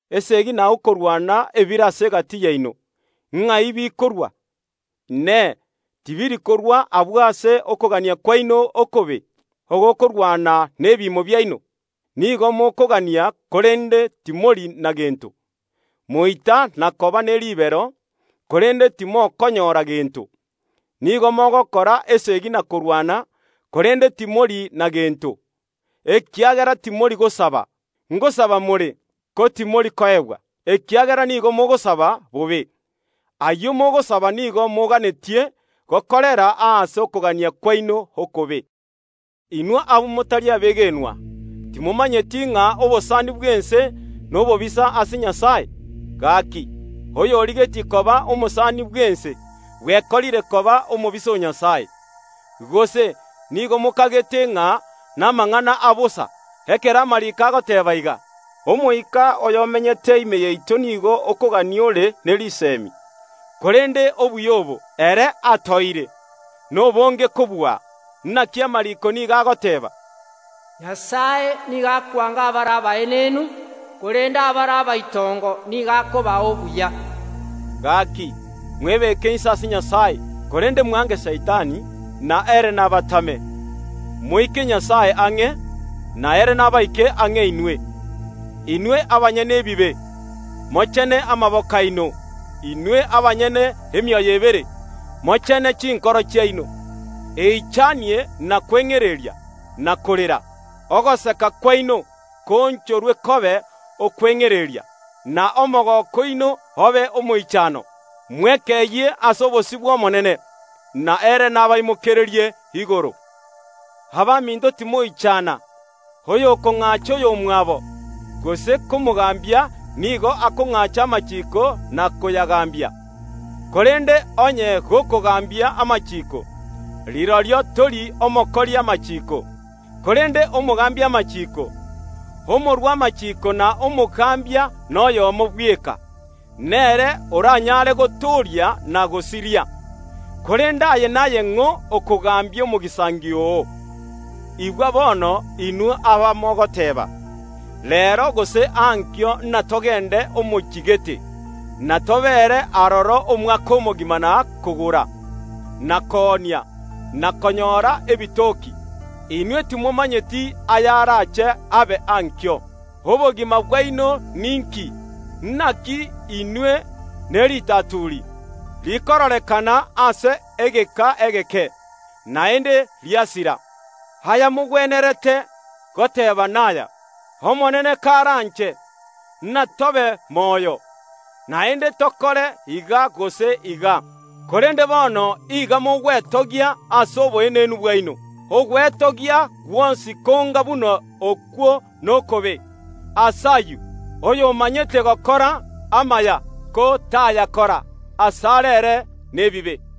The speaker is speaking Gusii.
Eseegi na okorwana ebire ase egati yaino, ng’ai bikorwa? Inee! Tibiri korwa agwo ase okogania kwaino okobe, ogokorwana nebiimo biaino? Nigo mokogania, korende timori na gento; moita na koba ne ribero, korende timokonyora gento. Nigo mogokora esegi na korwana, korende timori na gento, ekiagera timori gosaba. Ngosaba more, ko timori koegwa, ekiagera nigo mogosaba bobe. Ayio mogosaba nigo moganetie gokorera ase okogania kwaino okobe. Inwe abamotari abegenwa, timomanyeti ng’a obosani bw’ense nobobisa ase Nyasae? Gaki, oyorigetie koba omosani bw’ense bwekorire koba omobisa o Nyasae. Gose nigo mokagete ng’a namang’ana abosa, ekero amariiko agoteeba iga, “Omoika oyomenyete ime yaito nigo okogania ore ne risemi.” Korende obuya obo, ere atoeire, nobonge kobua. Naki amariiko nigo agoteeba, “Nyasae nigo akwanga abare abaenenu, korende abare abaitongo nigo akobaa obuya.” Gaki, mwebeke inse ase Nyasae; korende mwange Saitani, na ere nabatame. Moike Nyasae ang’e, na ere nabaike ang’e inwe. Inwe abanyene ebibe, mochene amaboko aino; inwe abanyene emioyo ebere, mochene chinkoro chiaino. Eichanie na kweng’ereria, na korera. Ogoseka kwaino koonchorwe kobe okweng’ereria, na omogooko oino obe omoichano. Mwekeyie ase obosio bw’Omonene, na ere nabaimokererie igoro. Abaminto, timong’achana. Oyokong’acha oyomwabo, gose komogambia nigo akong’acha amachiiko na koyagambia, korende onye gokogambia amachiiko, rirorio tori omokori amachiiko, korende omogambia amachiiko. Omorua amachiiko na omogambia noyomo bweka, nere oranyare gotooria na gosiria. Korende aye naye ng’o okogambia omogisangio oo? Igwa bono inwe abamogoteeba, “Reero gose ankio inatogende omochie gete, na tobeere aroro omwaka omogima na kogora, na koonia, na konyora ebitoki.” Inwe timomanyeti ayarache abe ankio. Obogima bwaino ninki? Naki inwe neritaturi, rikororekana ase egeka egeke, naende riasira. Ayamogwenerete goteeba naya, “Omonene karanche, natobe moyo, naende tokore iga gose iga”. Korende bono iga mogwetogia ase oboenenu bwaino. Ogwetogia gwonsi konga buna okwo nokobe. Ase ayio, oyomanyete gokora amaya, ko tayakora, asare ere nebibe.